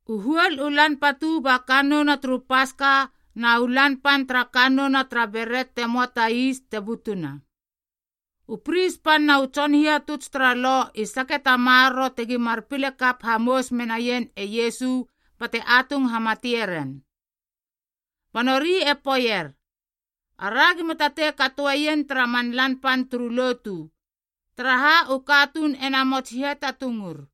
U huol u lan patu ba kannouna turu Paska na u lan pan tara kannouna tara Beret te möa ta is te butuna. U pris pan na u tson hihatuts tara Lo i sake ta maroro tegi mar pile kap hamous menaien e Iesu bate atung hamatie ren. Ba nori e poeier, “Ara gima tatei katoeien tara man lan pan turu lotu, taraha u katuun e namots hiatatungur.”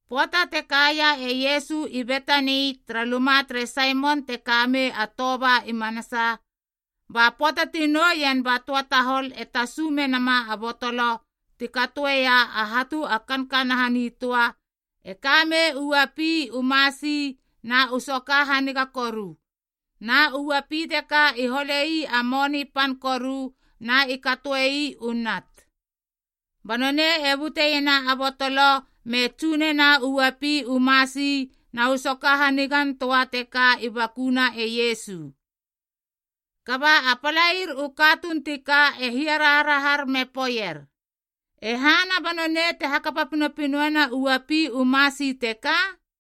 Pöata te kaia e Iesu i Betani tara luma tere Saimon te ka mei a toba i manasaa. Ba pöata ti nouien ba töa tahol e tasu menama a botolo ti katoeia a hatu a kankanaha nitöa e kamei u uapi u masi na u soka haniga koru, na u uapi teka i hole ii a moni pan koru na i katoe ii u nat. Ba nonei e buteiena a botolo me tsu nena u uapi u masi na u soka hanigantöa teka i bakuna e Iesu. Kaba a palair u katuun ti ka e hiaraharahar me poeier, “E hana ba nonei te hakapa pinopinoena u uapi u masi teka?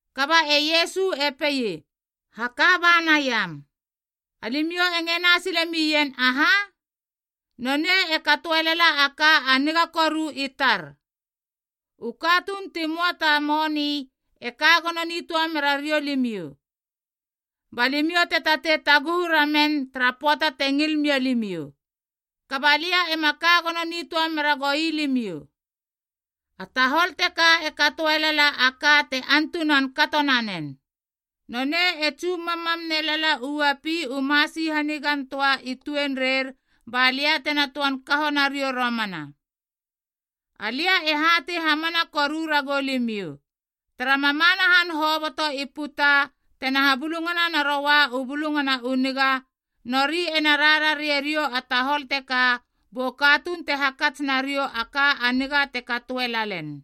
Kaba e Iesu e pei, “Haka ba naiam. Alimiou e ngena silemien aha? Nonei e katoe lala a ka a niga koru i tar. U katuun ti möa ta moni e ka gono nitöa mera riou limiou, ba limiou te tatei taguhu ramen tara pöata te ngil mia limiou. Kaba lia ema ka gono nitöa mera goi limiou. A tahol teka e katoe lala a ka te antunan kato nanen. Nonei e tsu mammam nelala u uapi u masi hanigantöa i tuenreir ba lia tena toan kaho nariou romana. Alia e hatei hamana koru ragou limiou, tara mamana han hoboto i puta tena habulungana naroua u Bulungana u Niga, nori ena rarare riou a tahol teka bu katuun te hakats nariou a ka a niga teka te katoe lalen.”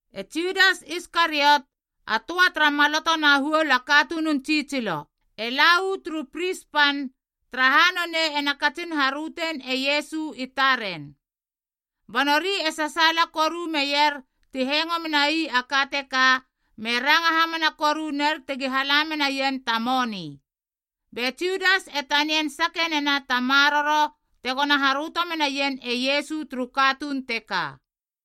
E Judas Iskariot, a töa tara maloto na huol a katunun tsitsilo, e la uu turu pris pan, taraha nonei ena katsin harötein e Iesu i taren. Ba nori e sasaala koru meier ti hengo menai a ka teka me ranga hamana koru ner tegi hala menaien ta moni. Be Judas e tanian sake nena ta maroro tegona haröto menaien e Iesu turu katuun teka.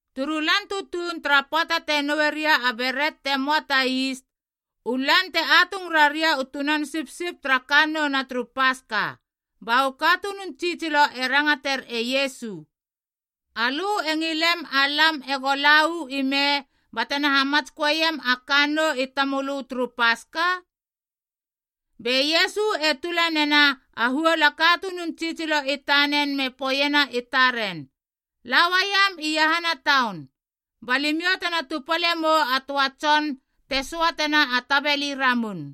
Turu lan tutuun tara pöata te noue ria a beret te möa ta is, u lan te atung raria u tunan sipsip tara kannouna turu Paska, ba u katunun tsitsilo e rangater e Iesu, “Alö e ngilem alam ego la uu ime batena hamatsköeiam a kannou i tamölö turu Paska?” Be Iesu e tula nena a huol a katunun tsitsilo i tanen me poeiena i taren, “La uaiam iahana taun, ba limiou tena tupale mou a töa tson te söatena a tabeli ramun.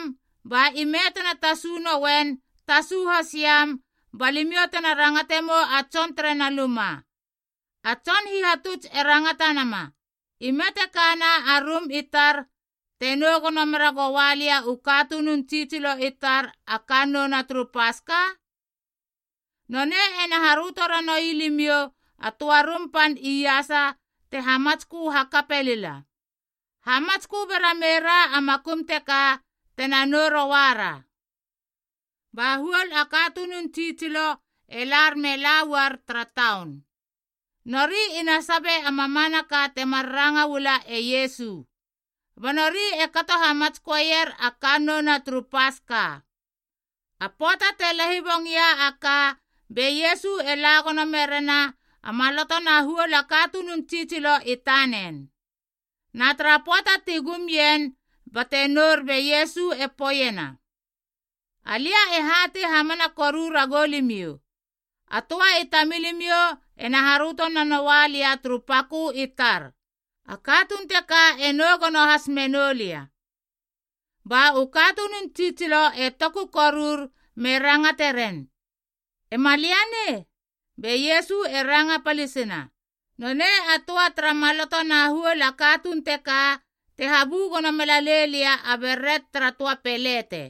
ba ime tena tasu nouen tasu hasiam balimiou tena rangate mou a tson tere na luma, ‘A Tson Hihatuts e rangatanama, Ime te kana a rum i tar, te nou gono meragoua lia u katunun tsitsilo i tar a kannouna turu Paska?’ Nonei ena haröto ranoui limiou a töa rum pan iasa te hamatskö hakape lila. Hamatskö bera meira a makum teka tena nou rouara.” Ba huol a katunun tsitsilo e lar me lauar tara taun, nori ina sabi a mamanaka temar ranga uama e Iesu. Ba nori e kato hamatsköeier a kannouna turu Paska. A pöata te lahibong ia a ka be Iesu e la gono merena a maloto na huol a katunun tsitsilo i tanen. Na tara pöata ti gumien bate nour be Iesu e poeiena, “Alia e hatei hamana koru ragou limiou, a töa i tamilimiou ena haröto nanoua lia turu pakö i tar, a katuun teka e nou gono has menou lia.” Ba u katunun tsitsilo e tokur me rangate ren, “Ema lia nei?” Be Iesu e ranga palisina, “Nonei a töa tara maloto na huol a katuun teka te habu gono melalei lia a beret tara töa pelete.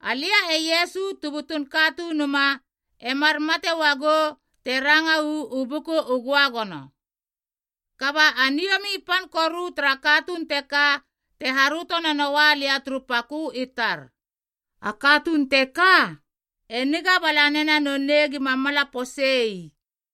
Alia tu butun Katunuma emar mate uagou te ranga uu Buku u Göagono. Kaba a niomi pan koru tara katuun teka te haröto nanoua lia turu pakö i tar. A katuun teka, e niga bala nena nonei gima mala pose ii.”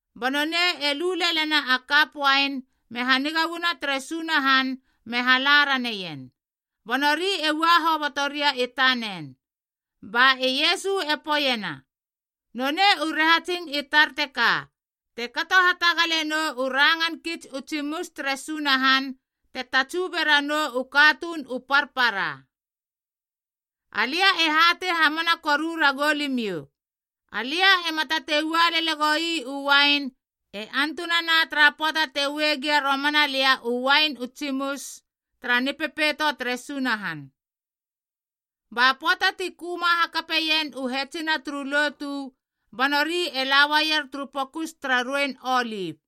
Ba nonei e lu lelena a kap uain me haniga uana tere Sunahan me hala raneien, ba nori e ua hoboto ria i tanen. Ba e Iesu e poeiena, “Nonei u rahatsing i tar teka te kato hatagale nou u rangan kits u tsimus tere Sunahan te tatsu beranou u katuun u parpara. Alia e hatei hamana koru ragou limiou, alia ema tatei ua lele goi u uain e antunana tara pöata te ue gia romana lia u uain u tsimus tara Nipepeito tere Sunahan.” Ba pöata ti köma hakapeien u hetsina turu lotu, ba nori e la uaier turu Pokus tara Ruein Olip.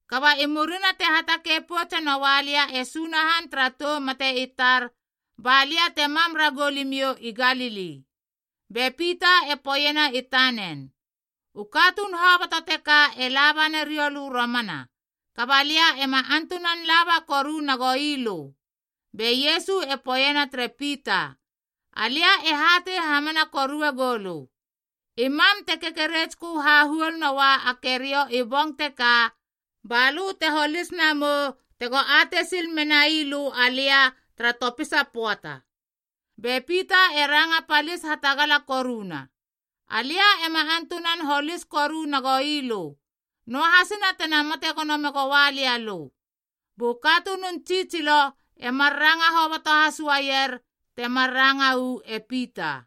“Kaba i murina te hatakei poutse noua lia e Sunahan tara tou mate i tar, ba lia te mam ragou limiou i Galili.” Be Pita e poeiena i tanen, “U katuun hoboto teka e laba nariou lö romana, kaba lia ema antunan laba koru nagou ii lö.” Be Iesu e poeiena tere Pita, “Alia e hatei hamana korue goulö, i mam te kekeretskö hahuol noua a keriou i bong teka, ba lö te holis namou tego atei sil menai lö alia tara topisa pöata.” Be Pita e ranga palis hatagala koruna, “Alia ema antunan holis koru nagoi lö, noahasina tena mate gono megoua lia alö.” Bu katunun tsitsilo emar ranga hoboto has uaier temar ranga uu e Pita.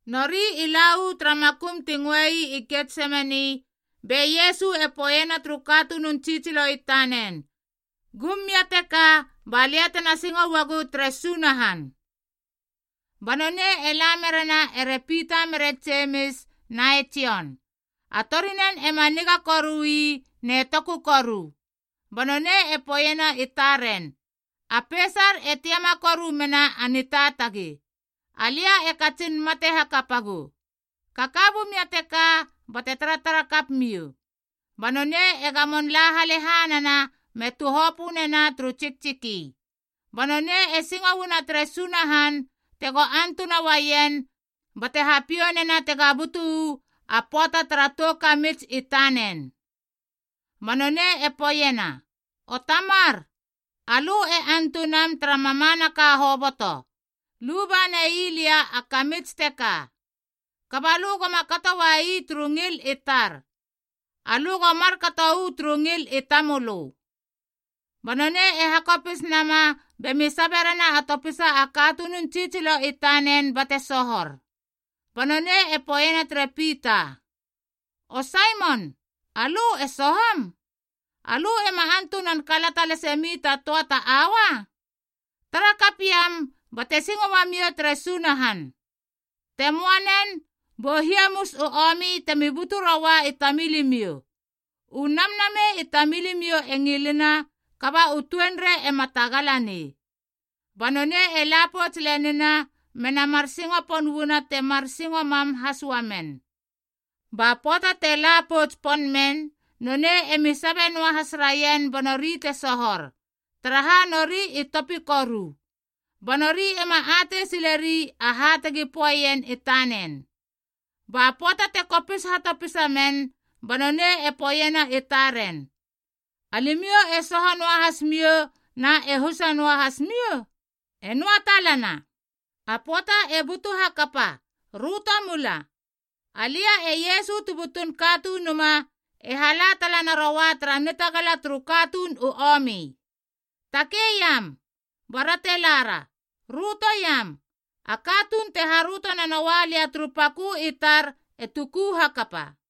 Nori i la uu tara makum ti ngöe ii Getsemani, be Iesu e poeiena turu katunun tsitsilo i tanen, “Gum mia teka ba lia tena singo uagu tere Sunahan.” Ba nonei e la merena ere Pita mere Jemis na e Jon, a torinen ema niga koru ii ne toku koru. Ba nonei e poeiena i taren, “A peisar e tiama koru mena a nitaatagi, alia e katsin mate hakapagu. Kaka bumia teka bate taratara kap miou.” Ba nonei e gamon la halehanana me tuhopö nena turu tsiktsiki. Ba nonei e singo uana tere Sunahan tego antuna uaien bate hapiou nena tega butu uu a pöata tara tou kamits i tanen. Ba nonei e poeiena, “O Tamar, alö e antunam tara mamanaka hoboto, luba nei lia a kamits teka. Kaba lö goma kato ua ii turu ngil i tar. Alö go markato uu turu ngil i tamölö.” Ba nonei e hakopis nama bemi saberena a topisa a katunun tsitsilo i tanen bate sohor. Ba nonei e poeiena tere Pita, “O Saimon, alö e sohom? Alö ema antunan kalata lase mi ta töa ta aua? Tara kap iam bate singo uamiou tere Sunahan. Te möa nen, bu hiamus u omi temi butu roua i tamilimiou U namnamei i tamilimiou e ngilina, kaba u tuenrei ema tagala nei.” Ba nonei e la pouts lenina mena mar singo pon uana temar singo mam has uamen. Ba pöata te la pouts pon men nonei emi sabe noahas raien ba nori te sohor, taraha nori i topi koru. Ba nori ema atei sileri aha tegi poeien i tanen. Ba pöata te kopis hatopisa men, ba nonei e poeiena i taren, “Alimiou e soho noahas miou na e husa noahas miou? E noa talana. A pöata e butu hakapa. Röto mula. Alia tu butun Katunuma e hala tala naroua tara nitagala turu katuun u omi. Takei iam, bara te lara. Rötoiam, a katuun te haröto nanoua lia turu pakö i tar e tuku hakapa.”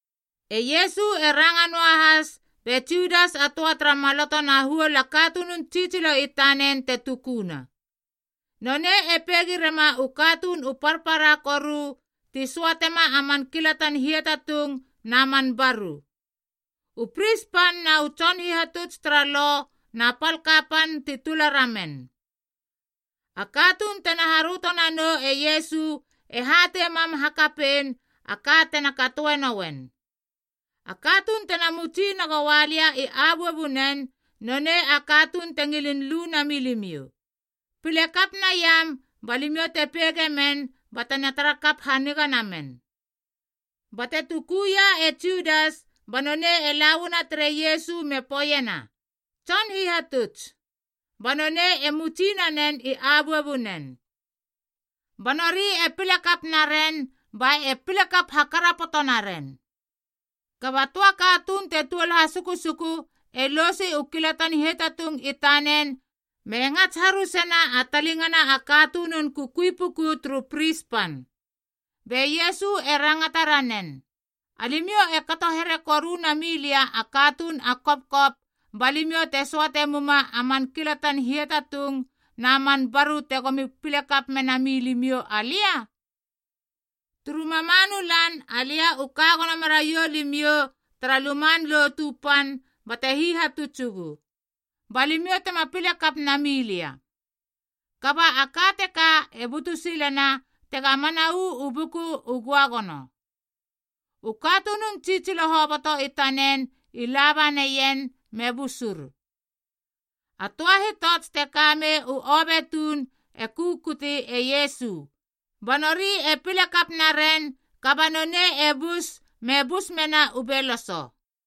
E Iesu e ranga noahas be Judas a töa tara maloto na huol a katunun tsitsilo i tanen te tukuna. Nonei e peigi rema u katuun u parpara koru ti söatema a man kilatan hiatatung na man baru. U pris pan na u tson hihatuts tara Lo na pal kapan ti tula ramen. A katuun tena haröto nanou e Iesu e hatei mam hakapein a ka tena katoe nouen. “A katuun tena mutsi nagoua lia i abuabunen, nonei a katuun te ngilin lu nami limiou. Pile kap naiam ba limiou te peige men bate tara kap haniga namen.” Bate tukuia e Judas ba nonei e la uana tere Iesu me poeiena, “Tson Hihatuts.” Ba nonei e mutsi nanen i abuabunen. Ba nori e pile naren ba e pile kap hakarapoto naren. Kaba töa katuun te tuol hasukusuku e lousi u kilatan hiatatung i tanen me ngats harusena a talingana a katunun kukui puku turu pris pan. Be Iesu e rangata ranen, “Alimiou e kato here koru na milia a katuun a kopkop balimiou te söate muma a man kilatan hiatatung na man baru tegomi pile kap mena milimiou alia? Turu mamanu lan alia u ka gono meraiou limiou tara Luman Lotu Pan bate hihatutsugu, ba limiou tema pile kap nami lia. Kaba a ka teka e butu silena tega mana uu Buku u Göagono.” U katunun tsitsilo hoboto i tanen i laba naien me busur. A töa hitots te kamei u obe tuun e kukuti e Iesu, ba nori e pile kap naren kaba nonei e bus me bus mena u beloso.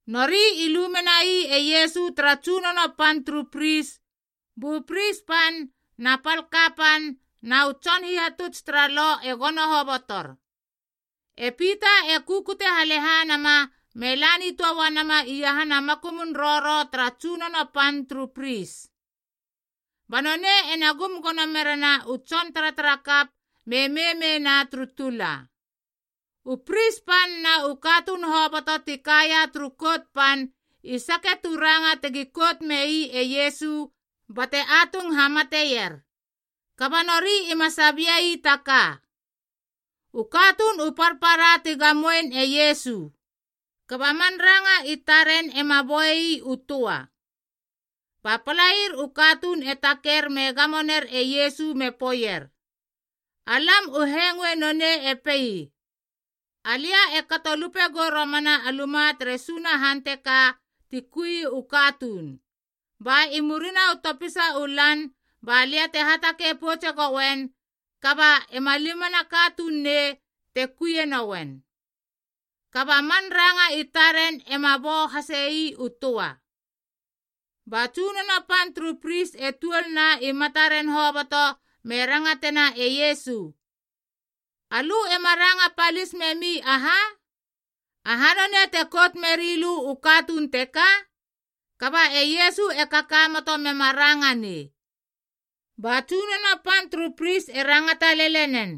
Nori i lu menai e Iesu tara tsunono pan turu pris, bu pris pan na pal kapan na u tson hihatuts tara Lo e gono hobotor. E Pita e kukute halehanama me la nitöa uana iahana makumun roro tara tsunono pan turu pris, ba nonei ena gum gono merena u tson taratarakap me meimeina turu tula. U pris pan na u katuun hoboto ti kaia turu Kout Pan i sake tu ranga tegi kout mei e Iesu bate atung hamateier. Kaba nori ima sabiei ta ka. U katuun u parpara ti gamoein e Iesu, kaba man ranga i taren ema boei ii u töa. Ba palair u katuun e taker me gamo ner e Iesu me poeier, “Alam u hengoe nonei e pei, ‘Alia e kato lupegou romana a luma tere Sunahan teka ti kui u katuun, ba i murina u topisa u lan balia te hatakei poutse gouen kaba ema limana a katuun nei te kuie nouen.’” Kaba a man ranga i taren ema bou hase ii u töa. Ba tsunono pan turu pris e tuolna i mataren hoboto me rangatena e Iesu, “Alö ema ranga palis memi aha? Aha nonei te kout merilö u katuun teka?” Kaba e Iesu e kakamoto mema ranga nei. Ba tsunono pan turu pris e rangata lele nen,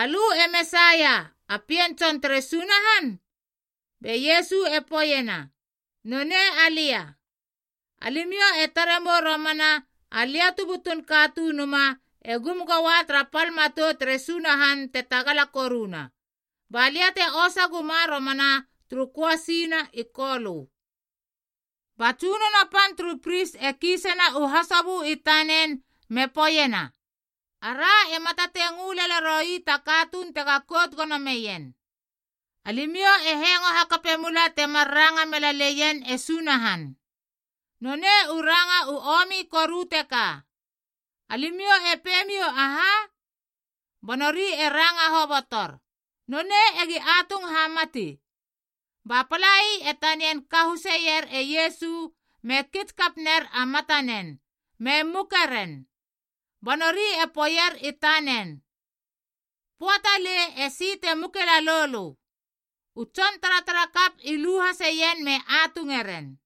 “Alö e Mesaia, a Pien Tson tere Sunahan?” Be Iesu e poeiena, “Nonei alia. Alimiou e tare mou romana Alia tu butun Katunuma e gum goua tara pal matou tere Sunahan te tagala koruna, ba lia te osa guma romana turu köasi na i kolö.” Ba tsunono pan turu pris e kiisena u hasobö i tanen me poeiena, “Ara ema tatei ngö lele roi ta katuun tega kout gono meien. Alimiou e hengo hakape mula temar ranga mela leien e Sunahan. Nonei u ranga u omi koru teka. Alimiou e peimiou aha?” Ba nori e ranga hobotor, “Nonei egi atung hamati.” Ba palai e tanian kahuseier e Iesu me kits kap ner a matanen me muke ren. Ba nori e poeier i tanen, “Poa talei esi te muke lalou lö.” U tson taratarakap i lu haseien me atunge ren.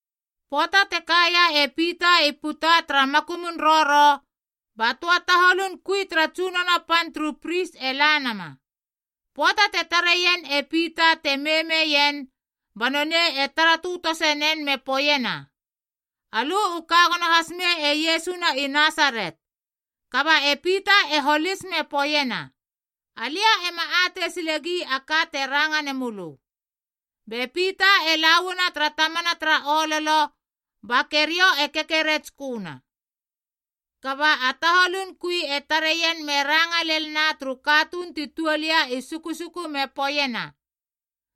Pöata te kaia e Pita i puta tara makumun roro, ba töa taholun kui tara tsunono pan turu pris e la nama. Pöata te tareien e Pita te meimeien ba nonei e tara tötose nen me poeiena, “Alö u ka gono has mei e Iesu na i Nasaret.” Kaba e Pita e holis me poeiena, “Alia ema atei silegi a ka te ranga nemu lö.” Be Pita e lauana tara tamana tara ololo, ba keriou e kekeretsköna. Kaba a taholun kui e tareien me ranga lel na turu katuun ti tuol ia i sukusuku me poeiena,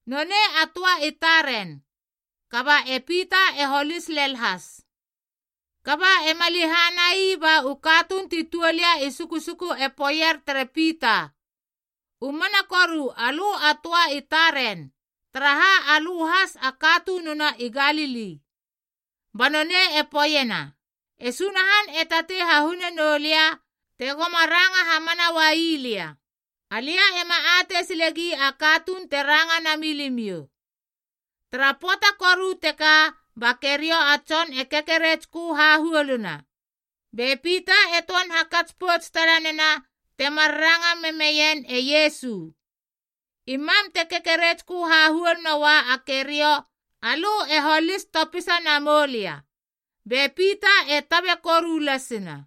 “Nonei a töa i taren.” Kaba e Pita e holis lel has. Kaba ema lehana ii ba u katuun ti tuol ia i sukusuku e poeier tere Pita, “U mana koru alö a töa i taren, taraha alö has a katununa i Galili.” Ba nonei e poeiena, “E Sunahan e tatei hahune noulia te goma ranga hamana uai lia. Alia ema atei silegi a katuun te ranga nami limiou.” Tara pöata koru teka ba keriou a tson e kekeretskö hahuoluna. Be Pita e töan hakats pouts tala nena temar ranga memeien e Iesu, “I mam te kekeretskö hahuol noua a keriou alö e holis topisa namou lia.” Be Pita e tabe koru lasina.